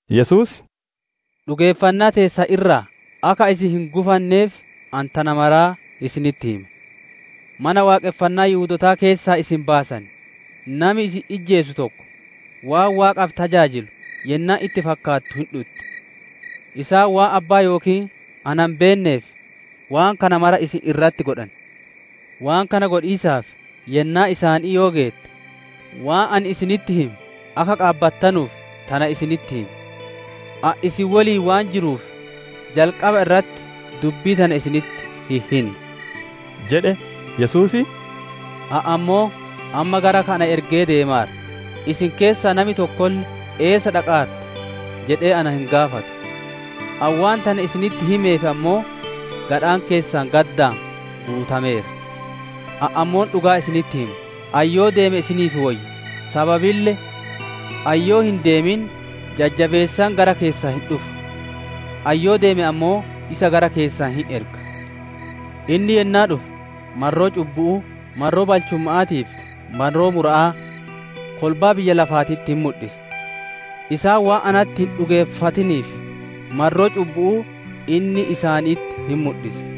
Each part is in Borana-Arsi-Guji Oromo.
Yesuus, «Dhugeeffannaa teessan irraa akka isin hin gufanneef, ani tana maraa isinitti hime. Mana Waaqonfannaa Yihudootaa keessaa isin baasan; nami isin ijjeesu tokko, waan Waaqaaf tajaajilu yennaan itti fakkaattu hin dhutti. Isaan waan Abbaa yookiin na hin beenneef waan kana mara isin irratti godhan. Waan kana godhiisaaf yennaan isaanii yoo geette, waan ani isinitti hime akka qaabattanuuf tana isinitti hime. «Ani isin woliin waan jiruuf, jalqaba irratti dubbii tana isinitti hin hinne» jedhe. Yesuus, «Ani ammoo amma gara ka ana ergee deemaara; isin keessaa nami tokkolle, ‹Eessa dhaqaarta?› jedhee na hin gaafatu. Ani waan tana isinitti himeef ammoo, gadhaan keessan gaddaan guutameera. Ani ammoo dhugaa isinitti hima: ani yoo deeme isinii woyya; sababille ani yoo hin deemin, Jajjabeessaan gara keessan hin dhufu. Ani yoo deeme ammoo, isa gara keessan hin erga. Inni yennaa dhufe, marroo cubbu'uu, marroo balchumma'aatii fi marroo mura'aa kolbaa biyya lafaatitti hin mudhisa. Isaan waan natti hin dhugeeffatiniif, marroo cubbu'uu inni isaanitti hin mudhisa;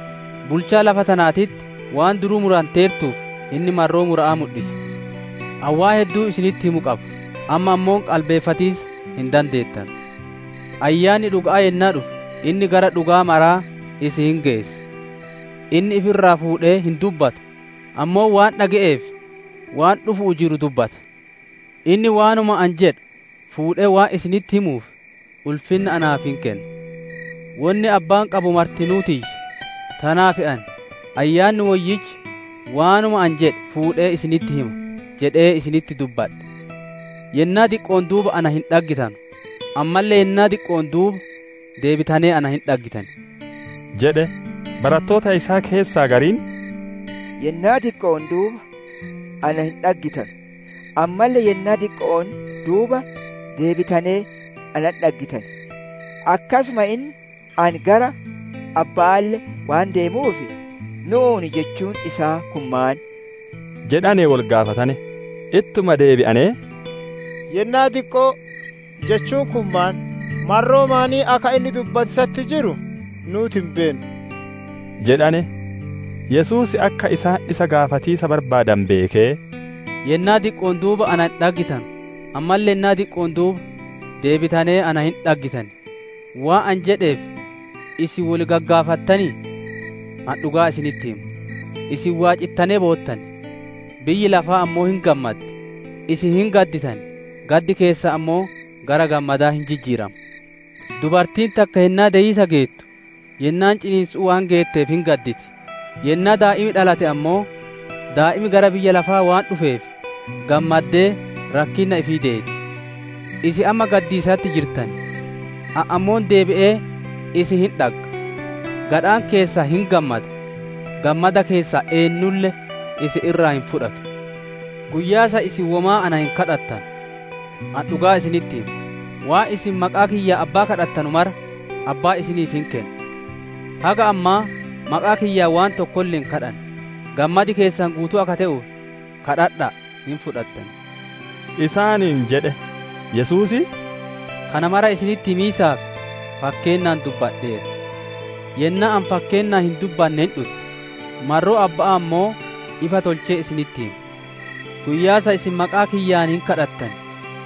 Bulchaa lafa tanaatitti waan duruu muranteertuuf, inni marroo mura'aa mudhisa. «Ani waan hedduu isinitti himu qaba, amma ammoo qalbeeffatiisa hin dandeettanu. Ayyaanni dhuga'aa yennaa dhufe, inni gara dhuga'aa mara isin hin geessa. Inni ifirraa fuudhee hin dubbatu, ammoo waan dhage'ee fi waan dhufu'uu jiru dubbata. Inni waanuma ani jedhu fuudhee waan isinitti himuuf, ulfinna naaf hin kenna. Wonni Abbaan qabu martinuu tiyya; tanaaf ani, ‹Ayyaanni Woyyichi waanuma ani jedhe fuudhee isinitti hima› jedhee isinitti dubbadhe. «Yennaa diqqo'oon duuba na hin dhaggitanu, ammalle yennaa diqqo'oon duuba deebitanee na hin dhaggitan» jedhe. Barattoota isaa keessaa gariin, « ‹Yennaa diqqo'oon duuba na hin dhaggitanu, ammalle yennaa diqqo'oon duuba deebitanee na hin dhaggitan; akkasuma inni ani gara Abba'aalle waan deemuuf› nu'uun jechuun isaa kun maan?» jedhanee wol gagaafatane. Ittuma deebi'anee, « ‹Yennaa diqqoo› jechuun kun maan? Marroo maanii akka inni dubbatiisatti jiru nuuti hin beennu» jedhane. Yesuus akka isaan isa gaafatiisa barbaadane beekee, « ‹Yennaa diqqo'oon duuba na hin dhaggitanu, ammalle yennaa diqqo'oon duuba deebitanee na hin dhaggitan› waan ani jedheef, isin wol gagaafattanii? Ani dhugaa isinitti hima: isin waacittanee boottan, biyyi lafaa ammoo hin gammaddi; isin hin gadditan, gaddi keessan ammoo gara gammadaa hin jijjiirama. Dubartiin takka yennaa deyiisa geettu, yennaan ciniinsu'uu waan geetteef hin gadditi; yennaa daa'imi dhalate ammoo, daa'imi gara biyya lafaa waan dhufeef gammaddee, rakkinna ifii deeti. Isin amma gaddiisatti jirtan; ani ammoo deebi'ee isin hin dhagga; gadhaan keessan hin gammada; gammada keessan eennulle isin irraa hin fudhatu. «Guyyaa san, isin womaa na hin gaafattanu. Ani dhugaa isinitti hima: Waan isin maqaa kiyyaan Abbaa gaafattanu mara Abbaan isiniif hin kenna. Haga ammaa maqaa kiyyaan waan tokkolle hin gaafanne; gammadi keessan guutuu akka te'uuf, gaafadha'a hin fudhattan» isaaniin jedhe. Yesuus, «Kana mara isinitti himiisaaf fakkeennaan dubbadheera. Yennaan ani fakkeennaan hin dubbanne hin dhutti; marroo Abba'aa ammoo ifa tolchee isinitti hima. Guyyaa san, isin maqaa kiyyaan hin gaafattan;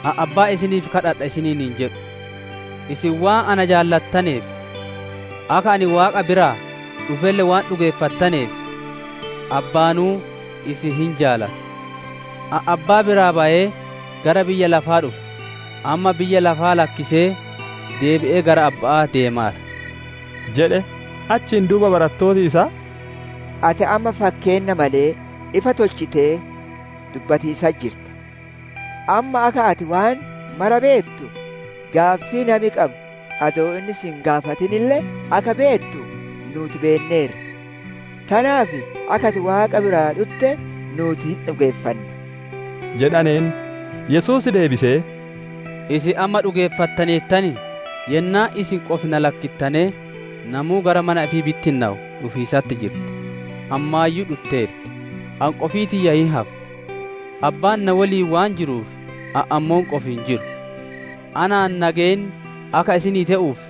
ani Abbaa isiniif gaafadha isiniin hin jedhu. Isin waan ana jaalattaneef, akka ani Waaqa biraa dhufelle waan dhugeeffattaneef, Abbaanuu isin hin jaalata. Ani Abbaa biraa bayee gara biyya lafaa dhufe; amma biyya lafaa lakkisee deebi'ee gara Abba'aa deemaara» jedhe. Achiin duuba barattooti isaa, «Ati amma fakkeenna malee, ifa tolchitee dubbatiisatti jirta. Amma akka ati waan mara beettu, gaaffii nami qabu adoo inni si hin gaafatinille akka beettu nuuti beenneerra. Tanaaf akka ati Waaqa biraa dhutte nuuti hin dhugeeffanna» jedhaneen. Yesuus deebisee, «Isin amma dhugeeffattaneertanii? Yennaan isin qofi na lakkittanee namuu gara mana ifii bittinnowu dhufiisatti jirti; ammaayyuu dhutteerti; ani qofii tiyya hin hafa. Abbaan na woliin waan jiruuf, ani ammoo qofi hin jiru. Anaan nageenni akka isinii te'uuf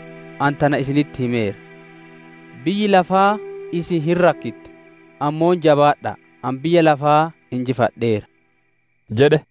ani tana isinitti himeera. Biyyi lafaa isin hin rakkitti; ammoo jabaadha'a! Ani biyya lafaa injifadheera» jedhe.